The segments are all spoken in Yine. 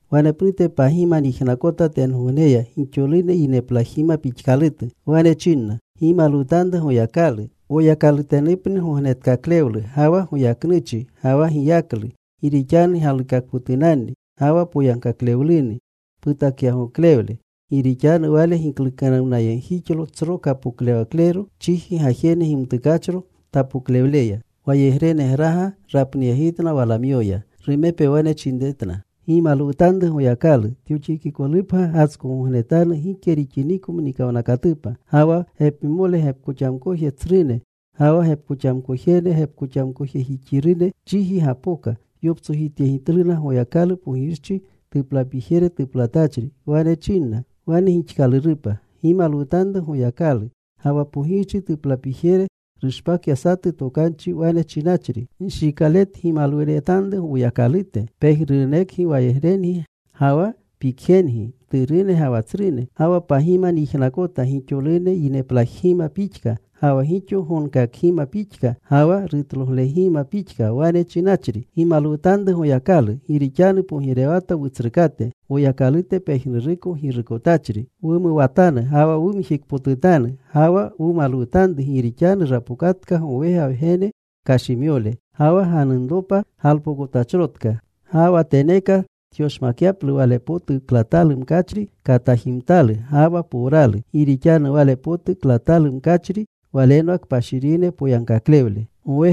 Wanepnute pagima nyijnakota tengogneya gixolune yineplajgima pixkalutu. Wane chinna: ¡Gimalwutanru Goyakalu! Woyakalutenupni gognetkaklewlu, ga wa goyaknuchi ga wa giyaklu. Gi rixanu galikakpotunanni ga wa poyagkaklewluni putakyagoklewle. Gi rixanu Wale giklukanuwnayegjixlo tsro kapoklewaklero, chiji gajene gimtukachro tapoklewleya. Wayegrenegraga rapnuyegitna walamyoya. Rumepe wane chinretna, ¡Gimalwutanru Goyakalu! Tyoxikikolupgya gatskogognenatanu gike rixiniko mnikawnakatupa. Ga wa gepmole gepkoxamkoje tsrune ga wa gepkoxamkojene gepkoxamkojejixirune chiji gapoka. Yoptsojityegitluna Goyakalu, pogirchi tuplapijere tuplatachri. Wane chinna: Wane gixkalurupa. ¡Gimalwutanru Goyakalu! Ga wa pogirchi tuplapijere rushpakya satu tokanchi wane chinachri: Nshikaletgimalwuretanru Woyakalute, pejnurunekgi wayegrengi, ga wa pikjengi, mturune ga wa tsrune. Ga wa pagima nyijnakota, gixolune yineplajgima pixka, ga wa gixo gonkakgima pixka, ga wa rutloglegima pixka, wane chinachri: ¡Gimalwutanru Goyakalu! Gi rixanu pogirewata Wutsrukate Woyakalute pejnuruko Girukotachri. Wumuwatanu ga wa wumjikpotutanu. Ga wa wumalwutanru. Gi rixanu rapokatka gowega Wgene kashimyole. Ga wa ganunropa galpokotachrotka. Ga wa teneeka tyoshmakyaplu wale potu klatalu mkachri katajimtalu ga wa powralu. Gi rixanu wale potu klatalu mkachri walenwa kpashirine poyagkaklewle.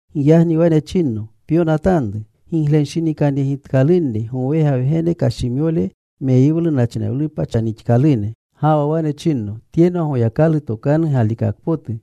Giyagni wane chinno, “Pyonatanru: Giglenshinikanyegitkalunni gowega Wgene kashimyole meyiwlu nachnewlupa chanixkalune.” Ga wa wane chinno, “Tyenwa Goyakalu tokanu galikakpotu.”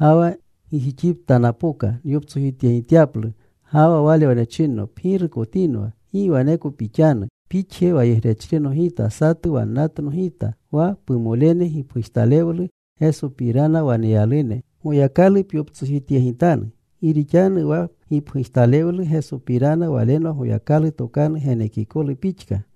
Ga wa gijixipta napoka nyoptsojityegityaplu. Ga wa wale wane chinno, “Pgirukotinwa. Gi waneko pixanu. Pixje wayegrechrino gita, satu wannatno gita, wa pumolene gipgujtalewlu Gesopirana waneyalune. Goyakalu pyoptsojityegitanu. Gi rixanu wa gipgujtalewlu Gesopirana walenwa Goyakalu tokanu genekikolu pixka.”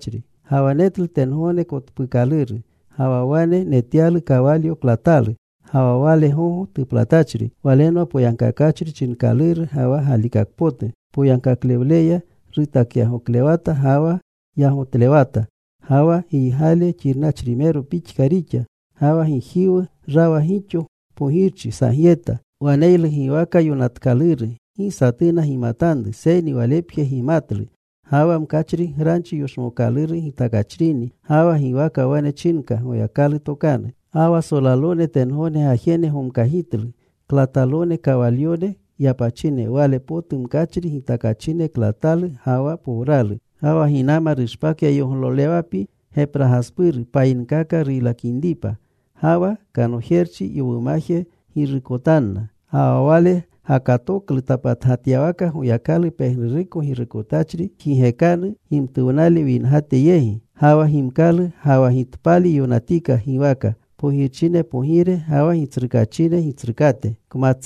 Ga wa netlu tengogne kotpuukaluru. Ga wa wane netyalu kawalyo klatalu. Ga wa wale gogo tuplatachri Walenwa Poyagkakachri chinkaluru, ga wa Galikakpotu. Poyagkaklewleya rutakyagoklewata ga wa yagotlewata. Ga wa giygale xirnachrimero pixka rixa. Ga wa gijiwu rawa gixo pogirchi sagyeta. Waneylu giwaka yonatkaluru, gi satuna gimatanru, seyni Walepje gimatlu. Ga wa mkachri granchi yoshmookaluru gitakachrini. Ga wa giwaka wane chinka Goyakalu Tokanu. Ga wa solalone tengogne gajene gomkagitlu, klatalone kawalyone yapachine, wale potu mkachri gitakachine klatalu ga wa powralu. Ga wa ginama rushpakya yoglolewapi gepragaspuru, payinkaka ruylakinripa. Ga wa kanojerchi yowumaje rugirukotanna. Ga wa Wale gakatoklu tapatgatyawaka, Goyakalu pejnuruko Girukotachri jigekanu gimtuwnale wingate yegi. Ga wa gimkalu ga wa gitpali yonatika giwaka: Pogirchine Pogire, ga wa gitsrukaachine Gitsrukate.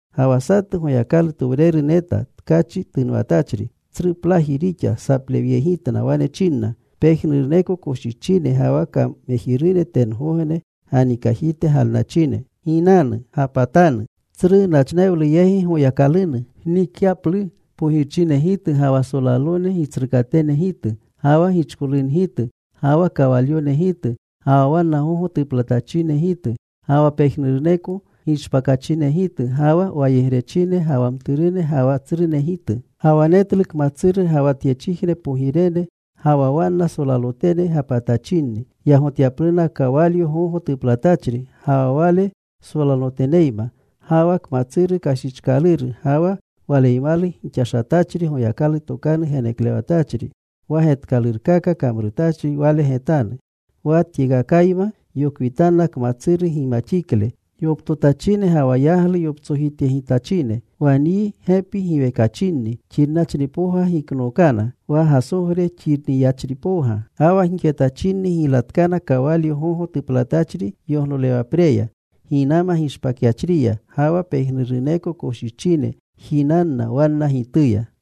Ga wa satu Goyakalutowreru neta tkachi tunwatachri. Tsruplaji rixa saplewleyegitna. Wane chinna pejnuruneko koshichine ga wa kamejirune tengogne ganikajite galnachine: Ginanu. Gapatanu tsru nachnewlu yegi Goyakalunu. Gnikyaplu pogirchinegitu, ga wa solalone gitsrukatenegitu, ga wa gichkolungitu, ga wa kawalyonegitu, ga wa wanna gogo tuplanatachinegitu, ga wa pejnuruneko gishpakachinegitu, ga wa wayegrechine ga wa mturune ga wa tsrunegitu. Ga wa netlu kmatsuru, ga wa tyechijne pogirene, ga wa wanna solalotene gapatachinni yagotyapluna kawalyo gogo tuplatachri ga wa Wale solaloteneyma. Ga wa kmatsuru kashichkaluru ga wa waleymalu gixashatachri Goyakalu tokanu geneklewatachri, wa getkalurkaka kamrutachri wale getanu. Wa tyekakayma yokwitanna kmatsuru gimaxikle yoptotachine, ga wa yaglu yoptsojityegitachine. Wa nyi gepi giwekachinni xirnachripowga giknookana, wa gasogre xirnyachripowga. Ga wa gixetachinni giylatkana kawalyo gogo tuplatachri yoglolewapreya ginama gishpakyachriya. Ga wa pejnuruneko koshichine jinanna wannanigituya.